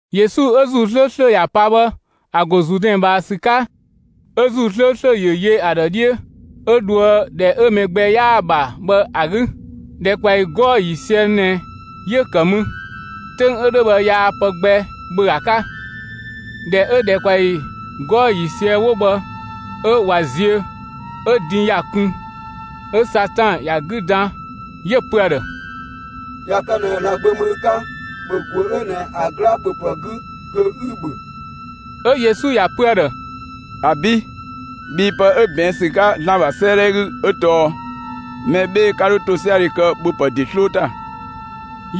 Yesu 'ö ‑Zuu 'slööslö ‑ya pa bhë ‑a ‑go Zuudɛn ꞊bhaa ‑sü 'ka, 'ö ‑Zuu 'slööslö ‑yö yö ‑a ‑dhë 'dhiö, 'ö dhoë ‑dhɛ 'ö mɛ gbɛ 'yaa‑ ‑bha bhë ‑a 'gü. ‑Dhɛkpaɔyi 'gɔɔ‑ ‑yiisië ꞊nɛ 'yö‑ ‑kë mü. 'Töng 'ö 'dhö bhë yaa pë gbɛ ‑bhö ‑a 'ka. ꞊Dhɛ 'ö ‑dhɛkpaɔyi 'gɔɔ‑ ‑yiisië 'wo bhë 'ö ꞊wa ziö, 'ö din ‑ya kun. 'Ö Satan ‑ya 'gü dan, 'yö‑ pö ‑a ‑dhë: «꞊Ya kë ꞊nɛ ‑Zlan Gbö ‑mü ü 'ka, ‑bhö ‑guö 'ö ꞊nɛ ‑a 'gla ‑bhöpë 'gü kö 'ü‑ ‑bhö!» 'Ö Yesu ‑ya pö ‑a ‑dhë: «‑Abi', bhii pë 'ö ꞊bɛɛn' ‑sü 'ka ‑Zlan ‑bha 'sëëdhɛ 'gü 'ö tɔɔ: Mɛ 'bhee‑ 'ka 'dho ‑tosiadhe kë ‑bhöpë ‑de 'sloo ‑ta!»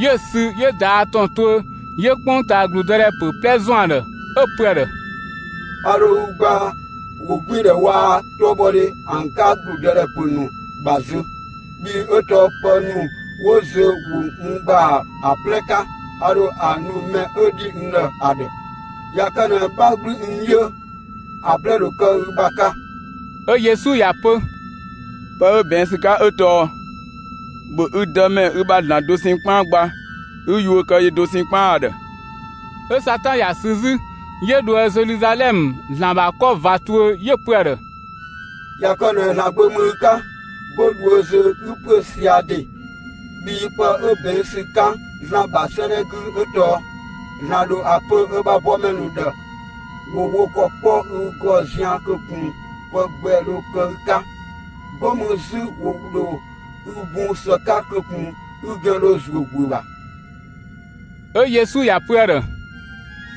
'Yö‑ ‑sü 'yö ꞊daa' ‑tɔn tuö 'yö 'kpongtaa ‑gludëdhɛ ‑pö 'plɛ ‑zɔn ‑a ‑dhë, 'Ö‑ pö ‑a ‑dhë: «A ‑dho ü gbaa ‑wogbiindhɛ waa‑ 'tɔbhɔdhe ‑an 'ka ‑gludëdhɛ ‑pö ‑nu ‑bha zö, bhii 'ö tɔɔ pë ‑nu 'wo zö ‑wo n ‑gbaa ‑a 'plɛ 'ka, a ‑dho ‑a nu mɛ 'ö ‑dhi n ‑dhë ‑a ‑dhë. ꞊Ya kë ꞊nɛ 'bha 'gblü n 'dhiö, ‑a 'plɛ ‑dho kë ü ‑bha 'ka.» 'Ö Yesu ‑ya pö: «Pë 'ö ꞊bɛɛn' ‑sü 'ka 'ö tɔɔ: ‑Bhö ü Dëmɛ, ü ‑bha ‑Zlan dosɛn 'kpaan gba 'ü yuö kë yö dosɛn 'kpaan ‑a ‑dhë.» 'Ö Satan ‑ya sü 'zü, 'yö dhoë Zeluzalɛmë, ‑Zlan ‑bha 'kɔ ꞊va tuö, 'yö‑ pö ‑a ‑dhë: «꞊Ya kë ꞊nɛ ‑Zlan Gbö ‑mü ü 'ka, 'go dhuö zö 'ü ‑püö sia‑ ‑de, bhii pë 'ö ꞊bɛɛn' ‑sü 'ka ‑Zlan ‑bha 'sëëdhɛ 'gü 'ö tɔɔ: ‑Zlan ‑dho ‑a pö ö bha bɔmɛ ‑nu ‑dhë ‑wo wo ‑kɔ 'kpɔ ü ‑gɔ zian‑ kö ꞊kun pë gbɛ dho kë ü 'ka. 'Go mü 'zü ‑wo ‑dho ü bun ‑së 'ka kö ꞊kun ü ‑gɛn dho ‑zuö ‑guö ‑bha.» 'Ö Yesu ‑ya pö ‑a ‑dhë: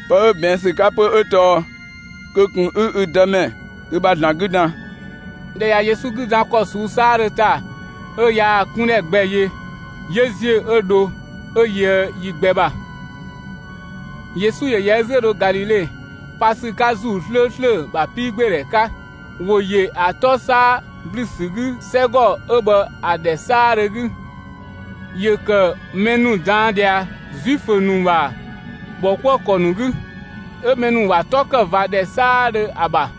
«Pë 'ö ꞊bɛɛn' ‑sü 'ka 'pö 'ö tɔɔ: Kö ꞊kun 'ü ü Dëmɛ ü ‑bha ‑Zlan 'gü dan!» ꞊Dhɛ ꞊ya Yesu 'gü dan ‑kɔ ꞊suu'‑ 'saadhö ‑ta 'ö yaa‑ 'kundhɛ gbɛ yö, 'yö ‑ziö 'ö dho 'ö yöë yi gbɛ ‑bha. Yesu ‑yö ‑yɛ ö 'zü 'ö dho Galile, pa ‑sü 'ka ‑Zuu 'slööslö ‑bha 'piigbeedhɛ 'ka. ‑Wo ‑yö ‑a 'tɔ 'saa ‑blü ‑sü 'gü 'sɛgɔ 'ö bhë ‑a ‑dhɛ 'saadhö 'gü. ‑Yö ‑kë mɛ ‑nu ꞊daan' ꞊dhia Zuifö ‑nu ‑bha ‑bhɔkuëkɔ ‑nu 'gü. 'Ö mɛ ‑nu ‑wa 'tɔ ‑kë ꞊va ‑dhɛ 'saadhö ‑a ‑bha.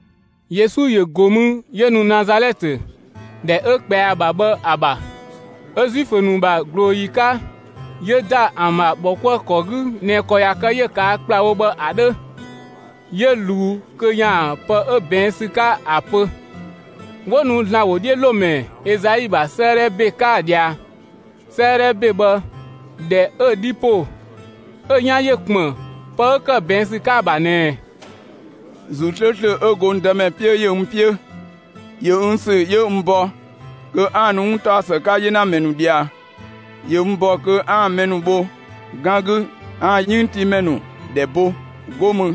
Yesu ‑yö ‑go mü 'yö nu Nazalɛtë, ‑dhɛ 'ö ꞊kpɛa ‑a ‑bha bhë ‑a ‑bha. 'Ö Zuifö ‑nu ‑bha ꞊glooyi 'ka 'yö ‑da ‑an ‑bha ‑bhɔkuëkɔ 'gü ꞊nɛ ‑kɔ ꞊ya kë 'yö‑ ꞊kaa' ‑kplawo bhë ‑a 'dhö; 'yö ꞊luu kö ‑yaan pë 'ö ꞊bɛɛn' ‑sü 'ka ‑a pö. 'Wo nu ‑Zlan ‑wodhiölomɛ Ezai ‑bha 'sëëdhɛ ‑be 'ka ‑a ꞊dhia. 'Sëëdhɛ ‑be bhë, ꞊dhɛ 'ö‑ 'dhi ‑po, 'ö‑ 'yan ‑yö ‑kpën pë 'ö ‑kë ꞊bɛɛn' ‑sü 'ka‑ ‑bha ꞊nɛɛ: ‑Zuu 'slööslö 'ö go n Dëmɛ 'piö ‑yö n 'piö, ‑yö n ‑sü 'yö n bɔ kö 'aan‑ nu 'wuntaɔsë 'ka 'yenamɛ ‑nu ꞊dhia. ‑Yö n ‑bɔ kö 'aan‑ mɛ ‑nu bho 'gan 'gü, 'aan‑ 'yënngtiimɛ ‑nu ‑dhɛ bo; 'go mü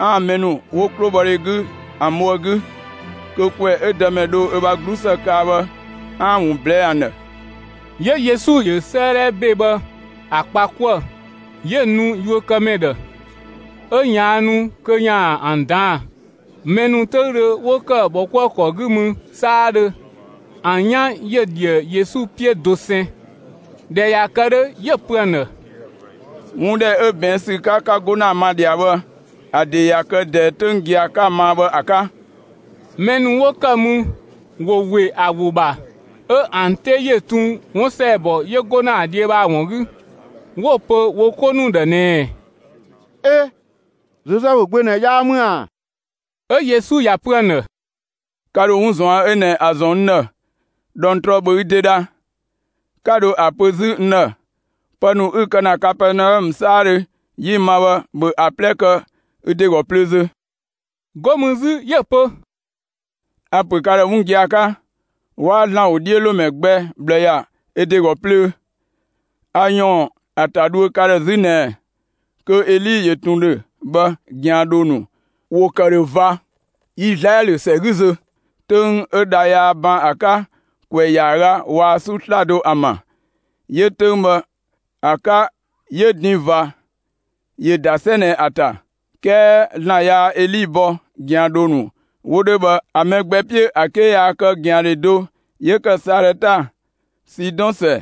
'aan‑ mɛ ‑nu 'wo 'klobhɔdhe 'gü ‑an bho ‑a 'gü, kö ‑kwɛ 'ö Dëmɛ dho ö bha 'glusë kaa bhë, 'aan‑ ‑a ‑wun ꞊blɛɛ'‑ ‑an ‑dhë. 'Yö Yesu ‑yö 'sëëdhɛ ‑be bhë ‑a kpa 'kuë‑, 'yö‑ nu yuökëmɛ ‑dhë, 'ö ꞊yaannu kö ‑yaan ‑an ꞊daan'‑. Mɛ ‑nu 'töüdhö 'wo ‑kë ‑bhɔkuëkɔ 'gü mü 'saadhö, ‑an 'yan ‑yö ꞊dhië Yesu 'piö dosɛn. ꞊Dhɛ ꞊ya kë 'dhö, 'yö‑ pö ‑an ‑dhë: «'Wun ‑dhɛ 'ö ꞊bɛɛn' ‑sü 'ka, 'ka 'go ‑na ma ꞊dhia bhë, ‑a ‑de ‑ya kë ꞊dɛɛ 'töng gia‑ 'ka‑ ‑maa bhë ‑a 'ka.» Mɛ ‑nu 'wo kë mü ‑wo ‑we ‑a ‑wo ‑bha, 'ö ‑an 'te ‑yö tun 'wun ‑sɛɛbɔ 'yö 'go ‑na ‑a dhiö bhë ‑a ‑wun 'gü, 'wo‑ pö wo 'ko ‑nu ‑dhë ꞊nɛɛ: «'E! Zozɛfu gbö ꞊nɛ 'yaa ‑mü ‑a?» 'Ö Yesu ‑ya pö ‑an ‑dhë: «Ka ‑dho 'wun ꞊zuan' 'ö ꞊nɛ ‑a ‑zɔn n ‑dhë: ‹꞊Dhɔngtrɔ, ‑bhö ü ‑de dha!› 'Ka dho ‑a pö 'zü n ‑dhë: ‹Pë ‑nu 'ü‑ ‑kë Kapɛɛnaɔmë 'saadhö 'yi‑ ‑ma bhë, ‑bhö ‑an 'plɛ kë ü ‑de ‑gɔ plöö zö!›» 'Go mü 'zü 'yö‑ pö: «A‑ ‑pö ka ‑dhë 'wun gia‑ 'ka: 'Waa ‑Zlan ‑wodhiölomɛ gbɛ ꞊bhlë ‑ya ö ‑de ‑gɔ plöö. A ‑yɔɔn ‑a ‑ta dhuö ka ‑dhë 'zü ꞊nɛ kö Eli ‑yö ꞊tun ‑dhö bhë, ꞊gɛandhoo ‑nu ‑wo ‑kë ‑dhö ꞊va Izlaɛlö ‑sɛ 'gü zö, 'töng 'ö dha yaa ban ‑a 'ka ‑kwɛ ‑yaaga waa‑ 'su 'slado ‑an ‑bha. 'Yö‑ 'töng bhë ‑a 'ka 'yö din ꞊va ‑yö ‑da 'sɛ ꞊nɛ ‑a ‑ta, 'kɛɛ ‑Zlan yaa Eli bɔ ꞊gɛandhoo ‑nu 'wo 'dhö bhë ‑an mɛ gbɛ 'piö ‑a 'ke yaa kë ꞊gɛandhe do 'yö ‑kë Salɛta, Sidɔn ‑sɛ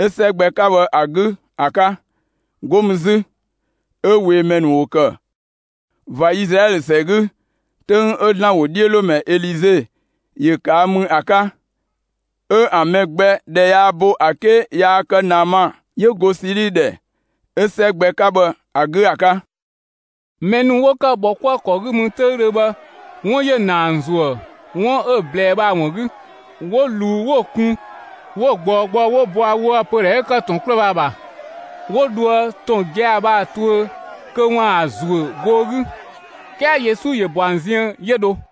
'ö 'sɛ gbɛ 'ka bhë ‑a 'gü ‑a 'ka. 'Go mü 'zü, 'ö ꞊weemɛ ‑nu ‑wo ‑kë ꞊va Izlaɛlö ‑sɛ 'gü 'töng 'ö ‑Zlan ‑wodhiölomɛ Elize ‑yö ꞊kaa' mü ‑a 'ka, 'ö ‑an mɛ gbɛ ‑dhɛ yaa bo ‑a 'ke yaa kë Naama 'yö go Sili ‑dhɛ 'ö 'sɛ gbɛ 'ka bhë ‑a 'gü ‑a 'ka.» Mɛ ‑nu 'wo ‑kë ‑bhɔkuëkɔ 'gü mü 'töüdhö bhë, 'wun ‑yö ‑na ‑an ‑zuë 'wun 'ö‑ ꞊blɛɛ bhë ‑a ‑wun 'gü. 'Wo ꞊luu 'wo‑ kun 'wo‑ ꞊gbɔɔ gbɔ 'wo bɔa woë‑ pödhɛ 'ö ‑kë ‑tɔn 'kluë‑ bhë ‑a ‑bha, 'wo dhoë ‑tɔn gia‑ bhë ‑a tuö kö ‑waan ‑a ‑zuö goo 'gü. 'Kɛɛ Yesu ‑yö ‑bɔ ‑an ziën 'yö dho.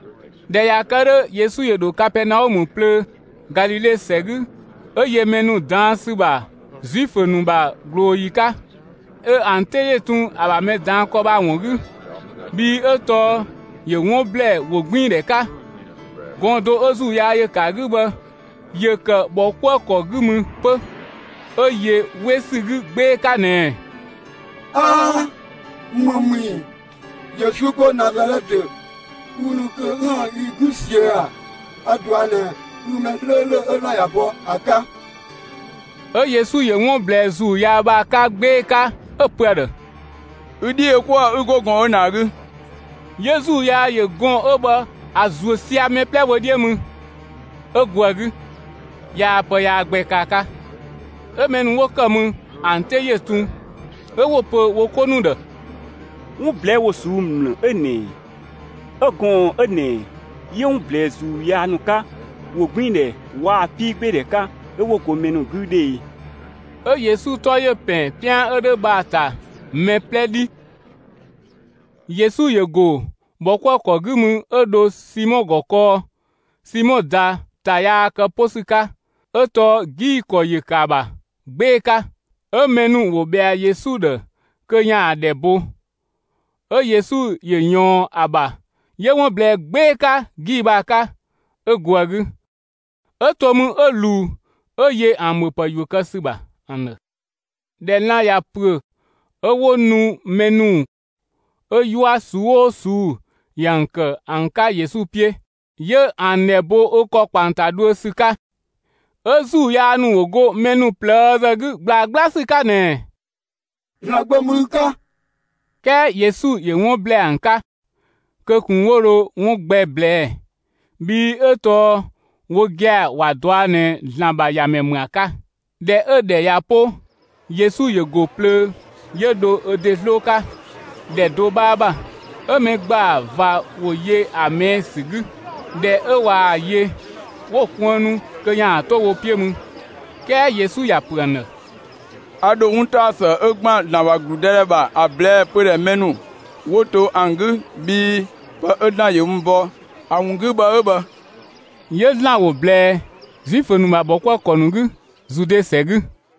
꞊Dhɛ ꞊ya kë 'dhö, Yesu ‑yö dho Kapɛɛnaɔmë plöö, Galile ‑sɛ 'gü, 'ö yö mɛ ‑nu ꞊daan' ‑sü ‑bha Zuifö ‑nu ‑bha ꞊glooyi 'ka. 'Ö ‑an 'te ‑yö ‑tun ‑a ‑bha mɛ ꞊daan' ‑kɔ bhë ‑a ‑wun 'gü, bhii 'ö tɔɔ ‑yö 'wun ‑blɛɛ ‑wogbiindhɛ 'ka. Gɔɔn‑ do 'ö ‑zuu yaa ‑yö ‑kë ‑a 'gü bhë, ‑yö ‑kë ‑bhɔkuëkɔ 'gü mü 'pö, 'ö yö 'we ‑sü 'gü 'gbee‑ 'ka ꞊nɛɛ: «'Aa! ‑Më ‑mü ‑i, Yesu 'go Nazalɛtë? Ü ‑nu kö 'üën‑ yi 'gü ꞊siö' ꞊a? A‑ ꞊dɔa' ꞊nɛ, ü mɛ 'slööslö 'ö ‑Zlan ‑ya bɔ ‑a 'ka!» 'Ö Yesu ‑yö 'wun ꞊blɛɛ ‑zuu yaa bhë ‑a 'ka 'gbee‑ 'ka 'ö‑ pö ‑a ‑dhë: «Ü 'dhi yö 'kuë‑ 'ü 'go gɔɔn‑ 'ö ꞊nɛ ‑a 'gü!» 'Yö ‑zuu yaa ‑yö gɔɔn‑ 'ö bhë ‑a ‑zuö sia‑ mɛ 'plɛ wö 'dhiö mü 'ö go ‑a 'gü; yaa pë yaa gbɛ kë ‑a 'ka. 'Ö mɛ ‑nu 'wo ‑kë mü ‑an 'te ‑yö tun, 'ö 'wo‑ pö wo 'ko ‑nu ‑dhë: «'Wun ꞊blɛɛ'‑ ‑wo ꞊suu'‑ ‑mlë 'ö ꞊nɛ ꞊ɛ? 'E, gɔɔn‑ 'ö ꞊nɛ ‑yö 'wun ‑blɛɛ ‑zuu yaa ‑nu 'ka ‑wogbiindhɛ waa‑ 'piigbeedhɛ 'ka, 'ö 'wo go mɛ ‑nu 'gü 'dhö e?» 'Ö Yesu 'tɔ ‑yö ‑pɛn 'pian 'ö 'dhö bhë ‑a ‑ta mɛ 'plɛ 'dhi. Yesu ‑yö ‑go ‑bhɔkuëkɔ 'gü mü 'ö dho Simɔ ‑gɔ kɔɔ. Simɔ ꞊da ‑ta yaa kë 'po ‑sü 'ka, 'ö tɔɔ 'gii‑ ‑kɔ ‑yö ‑kë ‑a ‑bha 'gbee‑ 'ka; 'ö mɛ ‑nu ‑wo ꞊bhɛa Yesu ‑dhë kö ‑yaan ‑a ‑dhɛ bo. 'Ö Yesu ‑yö ꞊yɔɔn ‑a ‑bha, 'yö 'wun ꞊blɛɛ 'gbee‑ 'ka 'gii‑ bhë ‑a 'ka, 'ö go ‑a 'gü, 'ö to mü 'ö ꞊luu 'ö yö ‑an ‑bhöpë ‑yuö kë ‑sü ‑bha ‑an ‑dhë. ꞊Dhɛ lan‑ ꞊ya ‑püö, 'ö 'wo nu mɛ ‑nu 'ö 'yua ꞊suu'‑ 'oo ꞊suu'‑ ‑yö ‑an ‑kë ‑an 'ka Yesu 'piö; 'yö ‑an ‑dhɛ bo ö ‑kɔ ‑kpa ‑an ‑ta dhuö ‑sü 'ka. 'Ö ‑zuu yaa ‑nu ‑wo go mɛ ‑nu ꞊plëëzë 'gü ꞊gblaa 'gbla ‑sü 'ka ꞊nɛɛ: «‑Zlan Gbö ‑mü ü 'ka!» 'Kɛɛ Yesu ‑yö 'wun ꞊blɛɛ ‑an 'ka, kö ꞊kun 'wo dho 'wun gbɛ ꞊blɛɛ'‑, bhii 'ö tɔɔ wo gia‑ ‑wa ꞊dɔa' ꞊nɛ ‑Zlan ‑bha ‑Yamɛ ‑mü ‑a 'ka. ꞊Dhɛ 'ö‑ ‑dhɛ ꞊ya 'po, Yesu ‑yö ‑go plöö 'yö dho ö ‑de 'sloo 'ka ‑dhɛ do 'bhaa ‑bha. 'Ö mɛ ‑gbaa ꞊va ‑wo yö ‑a ꞊mɛɛ' ‑sü 'gü. ꞊Dhɛ 'ö ꞊waa‑ yö, 'wo‑ kuënnu kö ‑yaan 'to wo 'piö mü. 'Kɛɛ Yesu ‑ya ‑pö ‑an ‑dhë: «A ‑dho 'wuntaɔsë 'ö ‑gban ‑Zlan ‑bha ‑gludëdhɛ ‑bha, ‑a ꞊blɛɛ pödhɛ mɛ ‑nu 'wo to ‑an 'gü; bhii pë 'ö ‑Zlan ‑yö n bɔ ‑a ‑wun 'gü bhë 'ö bhë.» 'Yö ‑Zlan ‑wo ꞊blɛɛ Zuifö ‑nu ‑bha ‑bhɔkuëkɔ ‑nu 'gü Zude ‑sɛ 'gü.